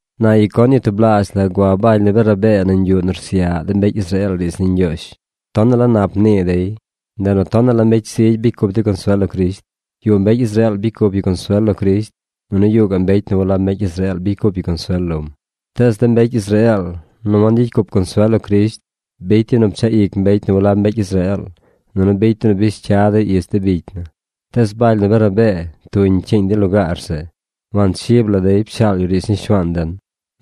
Na Iconio tublaazh la gua Baly nu Bernabee nañ yuꞌ nu rsyaꞌ de mbecy Israeel riidz ni Ñgyoozh. Tonaꞌ la nap mnii dey. Ndeꞌ nu tonaꞌ la mbecy zigy bicy cup dey consuel lo Crisht. Yuꞌ mbecy Israeel bicy cup yu consuel lo Crisht, nunu yuꞌ gaꞌ mbecy nu walab mbecy Israeel bicy cup yu consuel lom. Tees de mbecy Israeel nu wangyicy cup consuel lo Crisht bicy dey nu pchaꞌ ic mbecy nu walab mbecy Israeel, nunu bicy dey nu bish cya dey ich de bicy na. Tees Baly nu Bernabee tuñ pcyiiñ dey lugaar zeꞌ. Wanchib la dey pshaal yu riidz ni Shuaan den.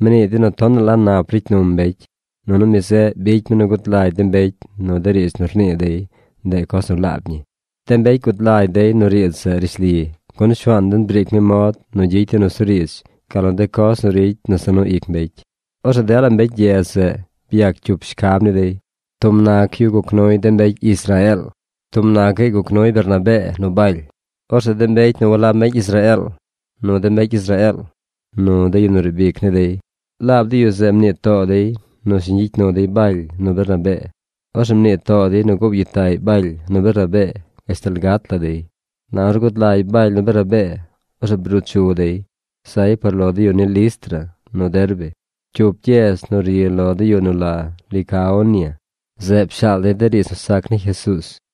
Mnii dey nu tonaꞌ la nap ricy num mbecy, nunu mi zeꞌ bicy mi nu gud lagy de mbecy nu de riidz nu rnii dey, ndeꞌ coz nu laab ñi. De mbecy gud lagy dey nu riidz zeꞌ rishli, gun Shuaan den briic mi mod nu gyicy dey nusuriidz gal nu de coz nu ricy nu za nu ic mbecy. Orzeꞌ dela mbecy gyedz zeꞌ byac cup shcab ni dey. Tub nac yu guc nuy de mbecy Israeel, tub nacaꞌy guc nuy Bernabee nu Baly. Orzeꞌ de mbecy nu walab mbecy Israeel, nu de mbecy Israeel, nu de yu nu riib ic ni dey, laab de yu zeꞌ mnii too dey nu shiñ gyicy nu dey Baly nu Bernabee. Orzeꞌ mnii too dey nu goow gyitaꞌy Baly nu Bernabee gashtal gat la dey. Na ornu gud lagy Baly nu Bernabee, orzeꞌ bruu chu dey. Zay par lo de yu ni Listra nu Derbe, cyup gyedz nu ri lo de yu nu la Licaonia. Zeꞌ pshaal dey de riidz nu sac ni Jesuuz.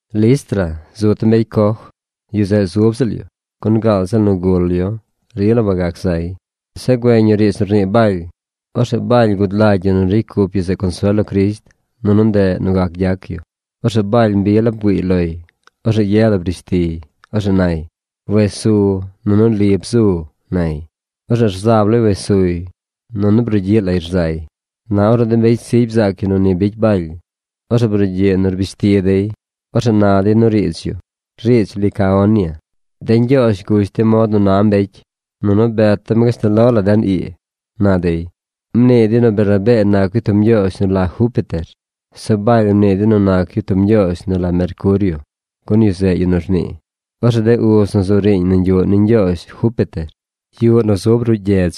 Listra zu tub mbecy coj. Yu zeꞌ zub ziꞌl yu, gun gaal ziꞌl nu gul yu rila wagac zay. Zeꞌ güeñ yu riidz nu rnii Baly. Orzeꞌ Baly gud lagy yu nu ricy cup yu zeꞌ consuel lo Crisht, nunu ndeꞌ nu gac gyac yu. Orzeꞌ Baly mbi la bgüiiy loy. Orzeꞌ ye la brish tiy. Orzeꞌ nay: ―¡Wes su nunu li bzu! ―nay. Orzeꞌ rzab lay wes suy. Nunu brugyiꞌ lay rzay. Na ornu de mbecy zigy bzaac dey nu ni bicy Baly, orzeꞌ brugyiꞌ nu rbish ti dey. Orzeꞌ na dey nu riidz yu, riidz Licaonia: ―¡De ñgyoozh gush dem mod nu na mbecy, nunu bet dem gashtal lo la den ii! ―na dey. Mnii dey nu Bernabee nac yu tub ñgyoozh nu la Júpiter. Zeꞌ Baly mnii dey nu nac yu tub ñgyoozh nu la Mercurio, gun yu zeꞌ yu nu rnii. Orzeꞌ de uz nu zu riiñ nañ yuꞌ ni ñgyoozh Júpiter, yuꞌ nu zub ruꞌ gyedz,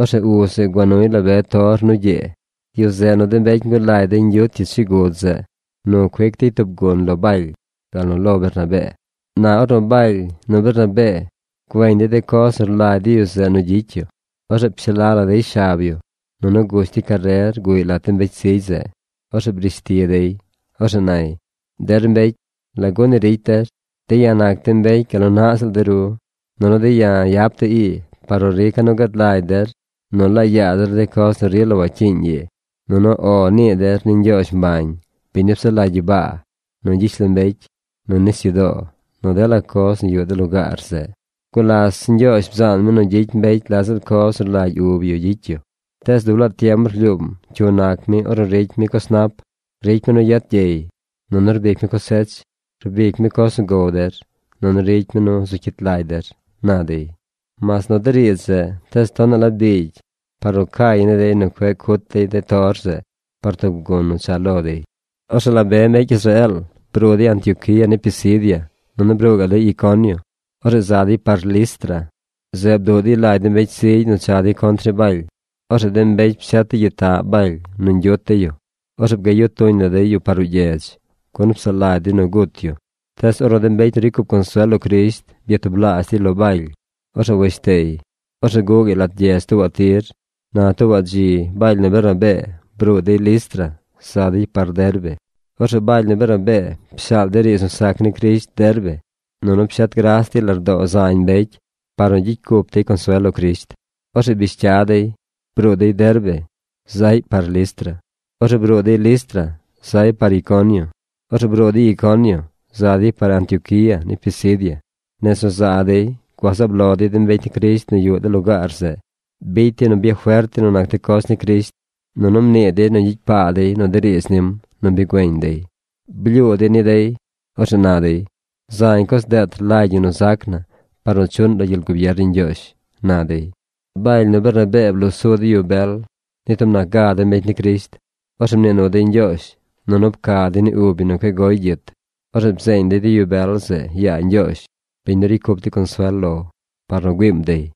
orzeꞌ uz zeꞌ gua nuy la be tor nu gyee. Yu zeꞌ nu de mbecy ngulagy dey ñgyuut yu chigud zeꞌ nu cuic dey tub gun lo Baly, gal nu lo Bernabee. Na ornu Baly nu Bernabee güeñ dey de coz nu rlagy de yu zeꞌ nu gyicy yu, orzeꞌ pshaa la dey shab yu, nunu gush dey carer guꞌy lat de mbecy zigy zeꞌ. Orzeꞌ brish ti dey. Orzeꞌ nay: ―Der mbecy, ¿lagu ni ricy der? De̱ ya̱ nac de̱ mbecy gal nu naꞌ ziꞌl de ru. Nunu de̱ ya̱ yap de̱ ii par nu rica̱ nu gad lagy der nu laa yaa der de coz nu rila wacyiiñ ii, nunu “O” nii der ni Ñgyoozh mbañ, biñ nu psaꞌ lagy gyibaa, nu gyishlombecy, nu nisyudoo, nu dela coz nu yuꞌ de lugaar zeꞌ. Gulas Ñgyoozh bzaan mi nu gyicy mbecy la ziꞌl coz nu rlagy ub yu gyicy yu. Tees dub laa tiem rlyuum cyu nac mi ornu ricy mi coz nap. Ricy mi nu yet gyey, nunu rbic mi cosech. Rbic mi coz nu gow der, nunu ricy mi nu zu cyit lagy der ―na dey. Mas nu de riidz zeꞌ, tees tonaꞌ la biigy par nu cay ni dey nu cueꞌ cut dey de tor zeꞌ par tub gun nu cha lo dey. Orzeꞌ la be mbecy Israeel bruu dey Antioquía ni Pisidia, nunu bruu gaꞌ dey Iconio. Orzeꞌ za dey par Listra. Zeꞌ bduꞌ dey lagy de mbecy zigy nu cha dey contr ni Baly. Orzeꞌ de mbecy pshet dey gyitaꞌ Baly nu ñgyut dey yu. Orzeꞌ bgayu tuñ la dey yu par ruꞌ gyedz, gun psaꞌ lagy dey nu gut yu. Tees ornu de mbecy nu ricy cup consuel lo Crisht byatublaazh dey lo Baly, orzeꞌ weshtey. Orzeꞌ guꞌ gaꞌy lat gyedz tuubaꞌ tir. Na tuubaꞌ dzi Baly nu Bernabee bruu dey Listra za dey par Derbe. Orzeꞌ Baly nu Bernabee pshaal dey riidz nu sac ni Crisht Derbe, nunu pshet gras dey lardoo zañ mbecy par nu gyicy cup dey consuel lo Crisht. Orzeꞌ bish cya dey. Bruu dey Derbe zaꞌy par Listra. Orzeꞌ bruu dey Listra. Zay par Iconio. Orzeꞌ bruu dey Iconio. Za dey par Antioquía ni Pisidia. Nez nu za dey, gua zaab lo dey de mbecy ni Crisht nu yuꞌ de lugaar zeꞌ. Bicy dey nu byafert dey nu nac de coz ni Crisht, nunu mnii dey nu gyicy paa dey nu de riidz nim nu bi güeñ dey. Blyuu dey ni dey. Orzeꞌ na dey: ―Zañ coz deet rlagy ñi nu zac na par nu chuꞌn lo gyel gubier ni Ñgyoozh ―na dey. Baly nu Bernabee bloo su dey yu bel ni tub nac ga de mbecy ni Crisht. Orzeꞌ mnii nu dey Ñgyoozh, nunu pca dey ni ub yu nu cueꞌ goy gyit. Orzeꞌ bzeeñ dey de yu bel zeꞌ yaa Ñgyoozh, biñ nu ricy cup dey consuel lo, par nu güiim dey.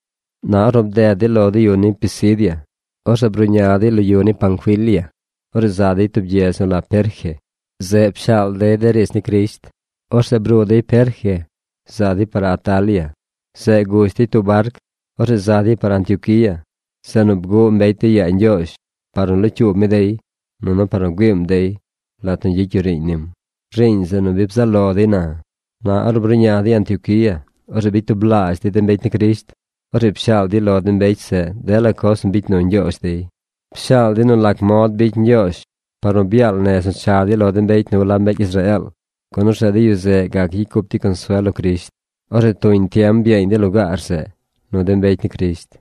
Na ornu bded dey lo de yu ni Pisidia, orzeꞌ bruꞌña dey lo yu ni Panfilia. Orzeꞌ za dey tub gyedz nu la Perge. Zeꞌ pshaal dey de riidz ni Crisht. Orzeꞌ bruu dey Perge, za dey par Atalia. Zeꞌ gush dey tub barc. Orzeꞌ za dey par Antioquía, zeꞌ nu bguꞌ mbecy dey yaa Ñgyoozh par nu locyuub mi dey nunu par nu güiim dey lat nu gyicy yu riiñ nim, riiñ zeꞌ nu bi bzaꞌ lo dey na. Na ornu bruꞌña dey Antioquía, orzeꞌ bicy tublaazh dey de mbecy ni Crisht. Orzeꞌ pshaal dey lo de mbecy zeꞌ dela coz nu bicy nu Ñgyoozh dey. Pshaal dey nu lac mod bicy Ñgyoozh par nu byaal nez nu cha dey lo de mbecy nu walab mbecy Israeel, gun orzeꞌ de yu zeꞌ gac gyicy cup dey consuel lo Crisht. Orzeꞌ tuñ tiem byeeñ dey lugaar zeꞌ nu de mbecy ni Crisht.